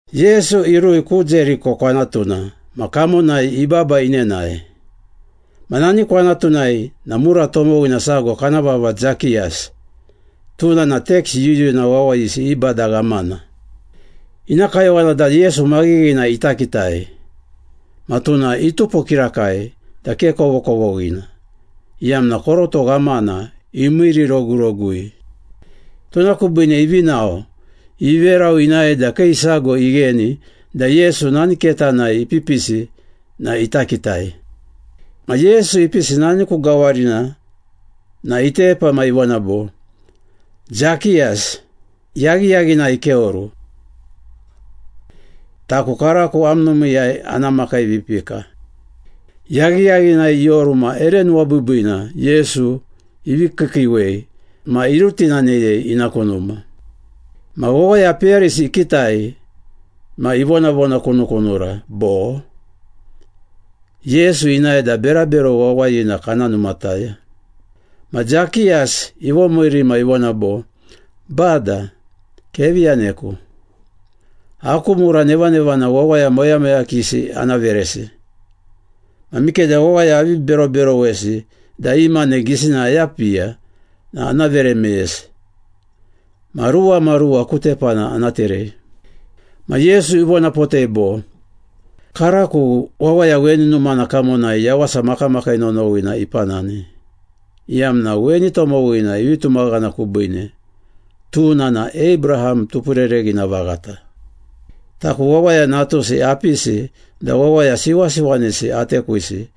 Yesu irui ku Jeriko kwanatuna ma kamonai ibaba inenae. Ma nani kwanatunai na mura tomowina sago kana vava Zakiyas, tuna na teks yuyuna wawayisi i bada ghamana. Ina kayowana da Yesu maghighina ita kitai, ma tuna itupo kirakai da ke kovokovoghina, iyamna koroto ghamana imiirirogurogui. Tuna kubiine ivi nao, iveru inae da kii sago igheni da Yesu nani ketanai ipipisi na ita kitai. Ma Yesu ipisi nani ku gawarina na itepa ma ivona bo, “Zakiyas, yaghiyaghinai keoru. Taku karako am numiiyai ana makiivipika.” Yaghiyaghinai ioru ma ere nuwabiibiina Yesu ivi kiikiiwei ma irutinaneyei ina ku numa. Ma wawaya peyarisi ikitai ma ivonavonakunukunura bo, “Yesu inae da berabero wawayina kana numataya.” Ma Zakiyas ivomiiri ma ivona bo, “Bada, kevi yaneku! Aku mura nevanevana wawaya moyamoyakisi ana veresi. Ma mikeda wawaya avi beroberowesi da i mane gisina ayapiya na ana vere meyesi, ma ruwamaruwa ku tepana ana terei.” Ma Yesu ivonapotei bo, “Karako wawaya weni numana kamonai yawasa makamakii nonowina ipanani, iyamna weni tomowina ivi tumaghana kubiine, tuna na Abraham tupurereghina vaghata. Taku Wawaya Natusi apisi da wawaya siwasiwanisi atekwisi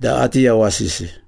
da ati yawasisi.”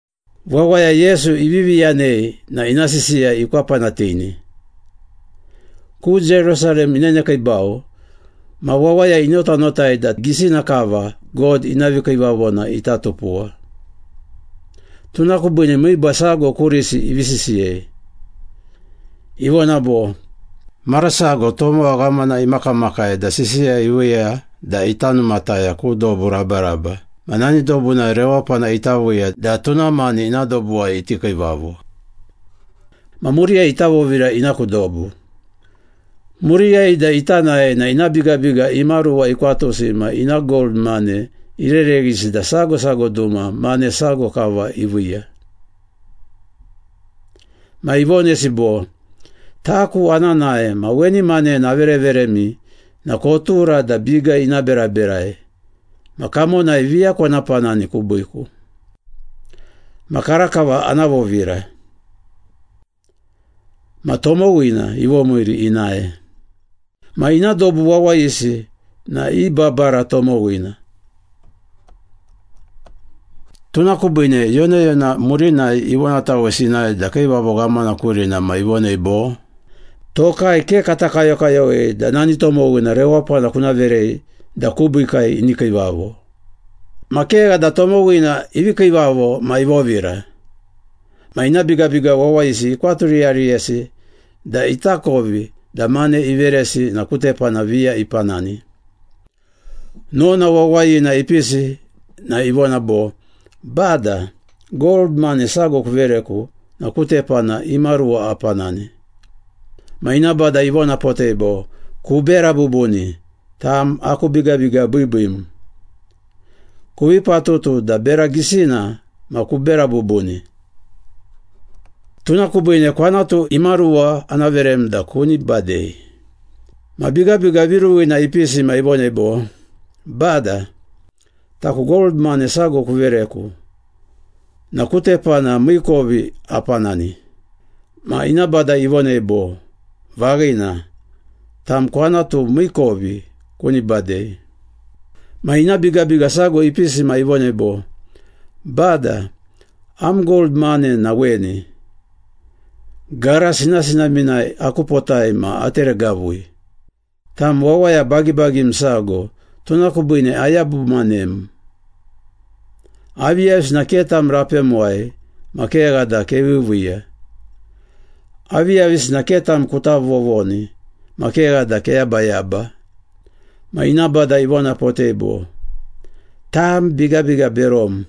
Wawaya Yesu ivivi yanei na ina sisiya ikwapanatini. Ku Jerusalem inenekiibau, ma wawaya inotanotai da gisina kava God ina vikiivavona ita tupuwa. Tuna kubiine miiba sago kurisi ivi sisiyei. Ivona bo, “Mara sago tomowa ghamana imakamakai da sisiya iviiya da ita numataya ku dobu rabaraba ma nani dobunai rewapana ita viiya da tuna mani ina dobuwai iti kiivavo. Ma muriyai ita vovira ina ku dobu. Muriyai da ita nae na ina bigabiga imaruwa ikwatusi ma ina gold mane irereghisi da sago sago duma mane sago kava iviiya. Ma ivonesi bo, ‘Taku ana nae ma weni manena avereveremi na kotura da biga ina beraberai, ma kamonai viya kona panani kubiiku. Ma karakava ana vovira.’ Ma tomowina ivomiiri inae. Ma ina dobu wawayisi na i babara tomowina. Tuna kubiine yonayona murinai ivonatawesi inae da kiivavo ghamana kurina ma ivonei bo, ‘Tokai ke kata kayokayowei da nani tomowina rewapana kuna verei da kubiikai ini kiivavo.’” “Ma kegha da tomowina ivi kiivavo ma ivovira. Ma ina bigabiga wawayisi ikwaturiyariyesi da itakovi da mane iveresi na ku tepana viya ipanani. Nona wawayina ipisi na ivona bo, ‘Bada, gold mane sago kuvereku na ku tepana imaruwa apanani.’ Ma ina bada ivonapotei bo, ‘Kubera bubuni, tam aku bigabiga biibiim. Kuvi patutu da bera gisina ma kubera bubuni. Tuna kubiine kwanatu imaruwa ana verem da kuni badei.’ Ma bigabiga viruwina ipisi ma ivonei bo, ‘Bada, taku gold mane sago kuvereku na ku tepana miikovi apanani.’ Ma ina bada ivonei bo, ‘Vaghina, tam kwanatu miikovi kuni badei.’” “Ma ina bigabiga sago ipisi ma ivonei bo, ‘Bada, am gold mane na weni, gara sinasinaminai akupotai ma ateregavui. Tam wawaya bagibagim sago, tuna kubiine ayabumanem. Aviyavisina ke tam rapemuwai ma kegha da keviiviiya. Aviyavisina ke tam kuta vovoni ma kegha da keyabayaba.’ Ma ina bada ivonapotei bo, ‘Tam bigabiga berom!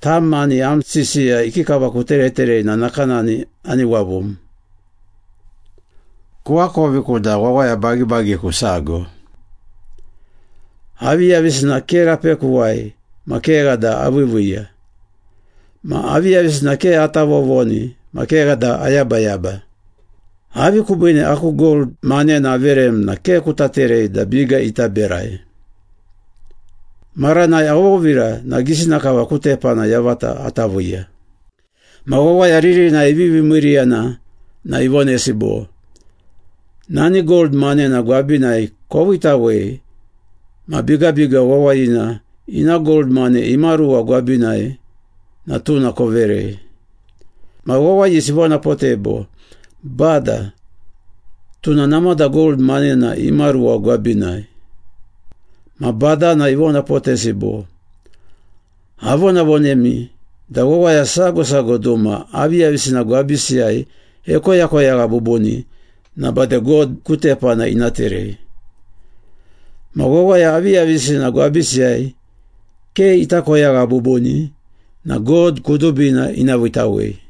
Tam mani am sisiya ikikava kutereterei na nakanani ani wavum! Kuakoviku da wawaya bagibagiku sago. Aviyavisina ke rapekuwai ma kegha da aviiviiya, ma aviyavisina ke ata vovoni ma kegha da ayabayaba. Avi kubiine aku gold manena averem na ke kuta terei da biga ita berai? Maranai avovira na gisina kava ku tepana yavata ata viiya.’” “Ma wawaya ririnai ivivi miiriyana na ivonesi bo, ‘Nani gold manena gwabinai koviitawei ma bigabiga wawayina ina gold mane imaruwa gwabinai na tuna koverei.’ Ma wawayisi ivonapotei bo, ‘Bada, tuna namada gold manena imaruwa gwabinai.’ Ma badana ivonapotesi bo, ‘Avonavonemi da wawaya sago sago duma aviyavisina gwabisiyai ekoyakoyagha bubuni na bade God ku tepana ina terei. Ma wawaya aviyavisina gwabisiyai ke ita koyagha bubuni na God kudubina ina viitawei.’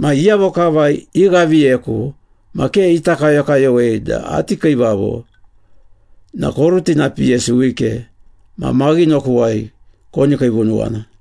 Ma iyavo kava ighaviyeku ma ke ita kayokayowei da ati kiivavo na korutinapiyesi wike ma maghinokuwai koni kiivunuwana.”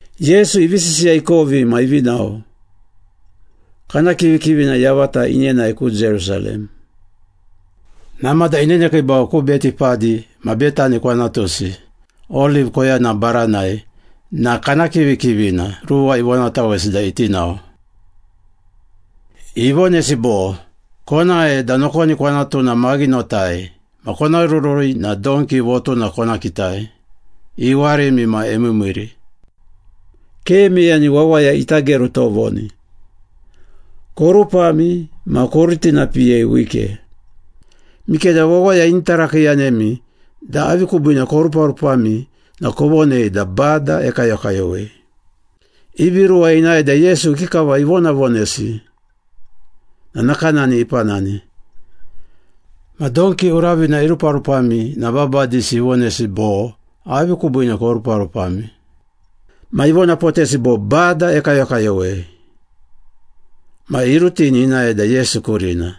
Yesu ivi sisiya ikovi ma ivi nao, kana kivikivina yavata inenae ku Jerusalem. Namada inenekiibau ku Betipadi ma Betani kwanatusi, Oliv koyana baranai na kana kivikivina ruwa ivonatawesi da iti nao. Ivonesi bo, “Konae, da nokoni kwanatuna maghinotai, ma kona rurui na donki votuna kona kitai, iwarimi ma emiimiiri. Ke meyani wawaya ita geru tovoni. Korupami ma korutinapiyei wike. Mikeda wawaya ini tarakiiyanemi da avi kubiine koruparupami na kovonei da Bada ekayokayowei.” Ivi ruwa inae da Yesu ikikava ivonavonesi na nakanani ipanani. Ma donki uravina iruparupami na babadisi ivonesi bo, “Avi kubiine koruparupami?” Ma ivonapotesi bo, “Bada ekayokayowei.” Ma irutini inae da Yesu kurina.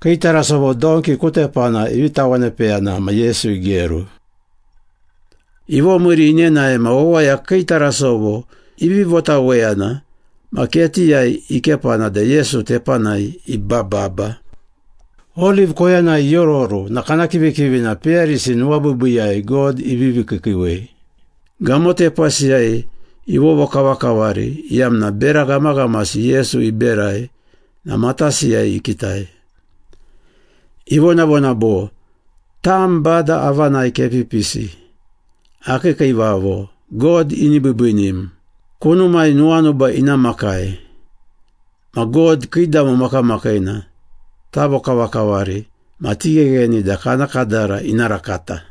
Kii tarasovo donki ku tepana ivi tawanepeyana ma Yesu igeru. Ivomiiri inenae ma wawaya kii tarasovo ivi votaweyana ma ketiyai ikepana da Yesu tepanai ibababa. Oliv koyanai iororu na kana kivikivina peyarisi nuwabiibiiyai God ivivi kiikiiwei, gamotepasiyai ivovokavakavari, iyamna bera ghamaghamasi Yesu iberai na matasiyai ikitai. Ivonavona bo, “Tam Bada avanai kepipisi, Akii kiivavo, God ini biibiinim, Kunumai nuwanuba ina makai, Ma God kiidamo makamakiina tavokavakavari ma tighegheni da kana kadara ina rakata!”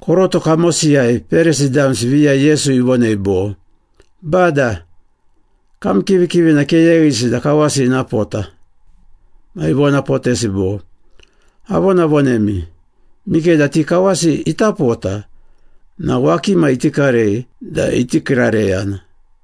Koroto kamosiyai Perisi damsi viya Yesu ivonei bo, “Bada, kam kivikivina keyeghisi da kawasi ina pota!” Ma ivonapotesi bo, “Avonavonemi, mikeda ti kawasi ita pota na wakima iti karei da iti kiirareyana.”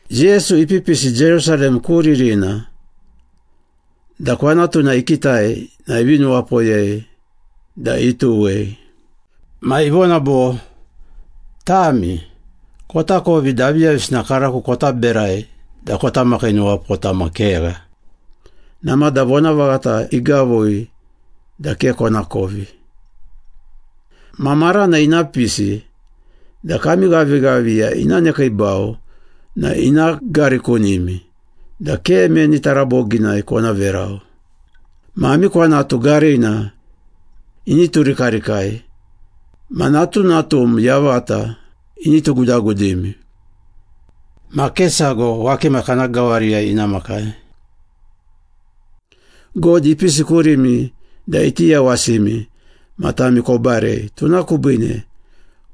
Yesu ipipisi Jerusalem ku ririna da kwanatuna ikitai na ivi nuwapoyei da ituwei. Ma ivona bo, “Tami, kotakovi da aviyavisina karako kota berai da kota makiinuwapota ma kegha, namada vonavaghata igavui da ke konakovi. Ma marana ina pisi da kami ghavighaviya ina nekiibau na ina garikunimi da ke meni taraboginai kona verau. Ma ami kwanatu garina ini turikarikai ma natunatum yavata ini tugudagudimi. Ma ke sago wakima kana gawariyai ina makai. God ipisi kurimi da iti yawasimi ma tami kobarei, tuna kubiine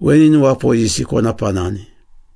weni nuwapoyisi kona panani.”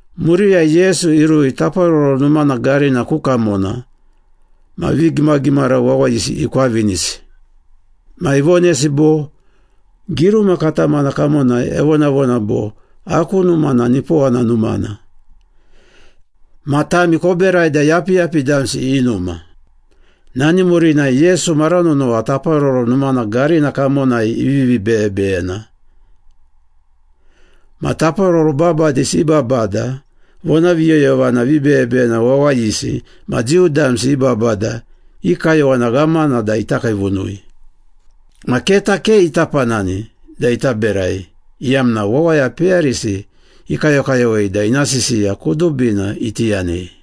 Muriyai Yesu irui Taparoro Numana garina ku kamona ma vigimagimara wawayisi ikwavinisi. Ma ivonesi bo, “Giruma katamana kamonai evonavona bo, ‘Aku numa na nipowana numana.’ Ma tami koberai da yapiyapi damsi i numa.” Nani murinai Yesu mara nonowa Taparoro Numana garina kamonai ivivi beyebeyena. Ma taparoro babadisi i babada, vonaviyoyovana vibeyebeyena wawayisi ma Jiu damsi i babada i kayowana ghamana da ita kiivunui. Ma keta ke ita panani da ita berai, iyamna wawaya peyarisi ikayokayowei da ina sisiya kudubina iti yanei.